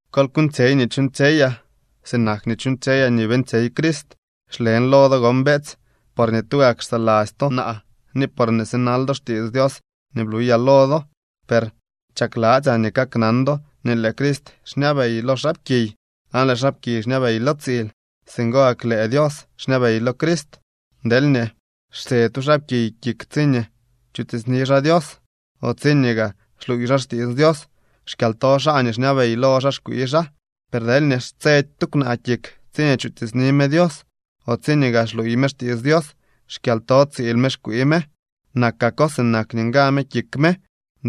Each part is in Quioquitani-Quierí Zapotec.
Kol kuuñtsyey nii chuuñtsyeyaa, sinak nii chuuñtsyeyaa nii beeñtsyey Crist. Xlen lo do gon, beetsy, porñee tugak xsaladzy to naa ni porñee sinal do xtiits Dios nii bluyaa lo do. Per chakladzyaa nii kaknan do nii lëë Crist xñabey lo xaapkiy, aan lëë xaapkiy xñabey lo tsiil. Singo gak lëë Dios xñabey lo Crist. Deelñee xtse tu xaapkiy kik tsiñee chutiitsni xaa Dios o tsiñee gaa xluuy xaa xtiits Dios, xkyalto xaa nii xñabey lo xaa xkwii xaa. Per deelñee xtsedy tu kwnaa kik tsiñee chutiitsni me Dios o tsiñee gaa xluuy me xtiits Dios, xkyalto tsiil me xkwii me. Nakako sinak nii nga me kik me.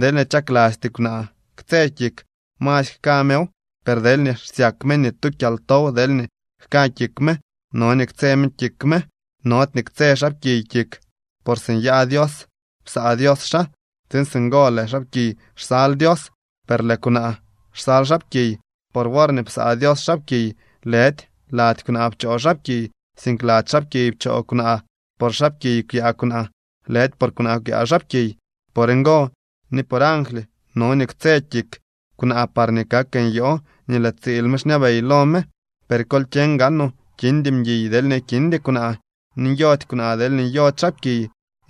Deelñee chaklasty kwnaa ktse kik, masy jka mew, per deelñee xsyak me nii tu kyaltow deelñee jka kik me, no nii ktse me kik me. Nody nii ktse xaapkiy kik, por si nyaa Dios psaa Dios xaa, tsiin singo lëë xaapkiy xsal Dios. Per lëë kwnaa xsal xaapkiy. Por worñee psaa Dios xaapkiy, lëdy lady kwnaa pchoo xaapkiy, sink lady xaapkiy pchoo kwnaa. Por xaapkiy kwyaa kwnaa, lëdy por kwnaa kwyaa xaapkiy. Por ngo ni por angly no nii ktse kik kwnaa parñee kak nyoo nii lëë tsiil me xñabey lo me. Per kol kyeñ gaanoo kindy mguiy deelñee kindy kwnaa ni nyody kwnaa deelñee nyody xaapkiy.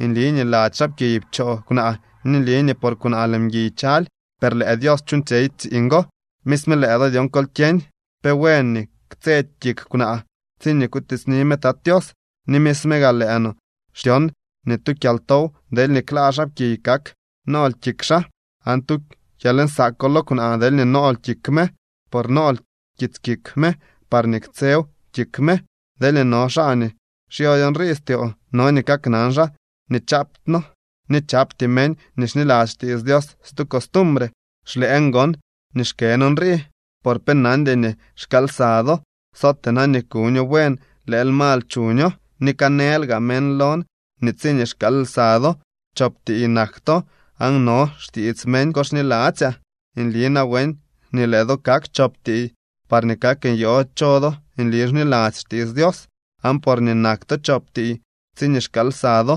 Nli nii lady xaapkiy pchoo kwnaa ni nli nii por kwnaa lëë mguiy chaly, per lëë Dios chuuñtsyey tsiiñ go. Misme lëë do dyon kol kyeñ pe buen nii ktsedy kik kwnaa tsiñee kutiitsni me Tat Tios. Ni misme gaa lëë no xtyon nii tu kyaltow deelñee klaa xaapkiy kak nool kik xaa, aan tu kyalnsaako lo kwnaa deelñee nool kik me, por nool kits kik me parñee ktsew kik me. Deelñee no xaa nii xyody nrii styoo, no nii kaknan xaa nii chaapty noo ni chapty meñ nii xniladzy xtiits Dios stu costumbre. Xlëën gon nii xkën nrii, por pe nandy nii xkaal lsa do, sootee na nii kuño buen lëël mal chuño. Ni kanëël gaa meñ lon nii tsiñee xkaal lsa do, chop tiiy nak to, aan no xtiits meñ go xniladzyaa. ¡Nli nawen nii lëë do kak chop tiiy parñee kak nyoo cho do nli xniladzy xtiits Dios! Aan porñee nak to chop tiiy tsiñee xkaal lsa do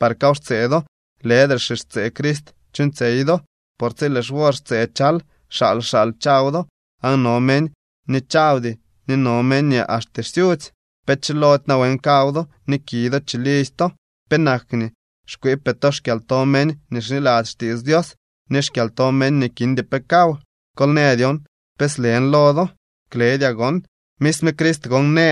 par kaw xtsee do, lëdre xixtsee Crist chuuñtsyey do. Por tsi lëë xwor xtsee chal, xaal xaal chaw do, aan no meñ nii chawdy ni no meñ nii axte xsyudzy. ¿Pe chilody nawen kaw do ni ki do chilidzy to? ¿Penak nii xkwiipee to xkyalto meñ nii xniladzy xtiits Dios ni xkyalto meñ nii kindy pe kaw? Kol në dyon pe slen lo do. ¡Kledyaa gon! Misme Crist gon në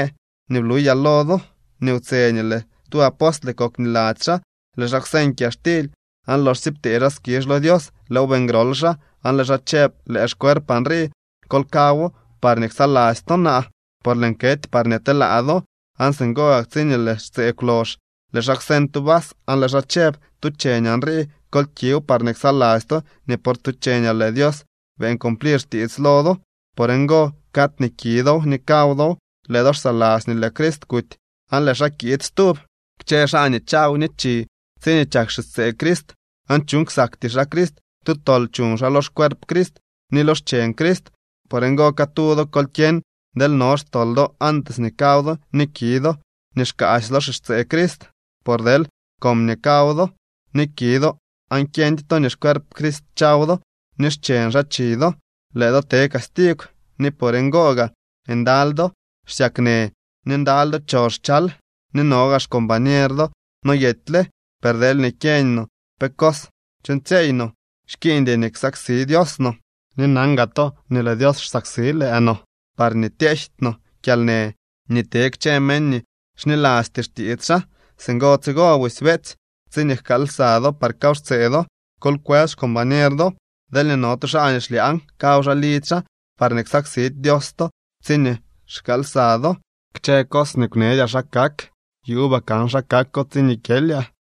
nii bluyaa lo do nii wtse nii lëë tu apostle kok niladzy xaa, lëë xaa kwseñ kyaxtily aan loxsye ptee xaa skizh lo Dios, lëëw beeñ grol xaa aan lëë xaa chëb: “Lëë xcuerpaa nrii. Kol kawo parñee ksaladzy to naa, por lëën kety parñee telaa do.” Aan singo gak tsiñee lëë xtsee kwlox lëë xaa kwseñ tu vas aan lëë xaa chëb: “Tu cheñaa nrii. Kol kiw parñee ksaladzy to nii por tu cheñaa lëë Dios beeñ cumplir xtiits lo do.” Por ngo cad nii ki dow ni kaw dow lëë do xsaladzy nii lëë Crist kuty aan lëë xaa kiid stub. Kchë xaa nii chaw ni chi tsiñee chak xixtsee Crist aan chuuñ ksakty xaa Crist, tu tol chuñ xaa lo xcuerp Crist ni lo xcheñ Crist. Por ngo catu do kol kyeñ deel no xtol do antes nii kaw do ni ki do nii xkaasy lo xixtsee Crist. Por deel comñee kaw do ni ki do aan xyeñdy to nii xcuerp Crist chaw do ni xcheñ xaa chi do, lëë do te castigw. Ni por ngo gaa ndaly do xsyaknë ni ndaly do choxchal, ni no gaa xcombañer do noyetyle. Per deelñee kyeeñ no pe cos chuuñtsyeey no, xkiiñdy nii ksaksi Dios no. Ni nan gaa to nii lëë Dios xsaksi lëë no, parñee tyejty no kyalnë nii te kchë meñ nii xnilasty xtiits xaa. Singo tsigo busy, beetsy, tsiñee jkaal lsa do par kaw xtsee do, kol kwës xcombañer do. Deelñee no tu xaa nii xlyaañ, kaw xaa lidzy xaa, parñee ksaksidy Dios to tsiñee xkaal lsa do. Kchë cos nii kwneedyaa xa kak yuubaa kan xa kako tsiñee kyelyaa.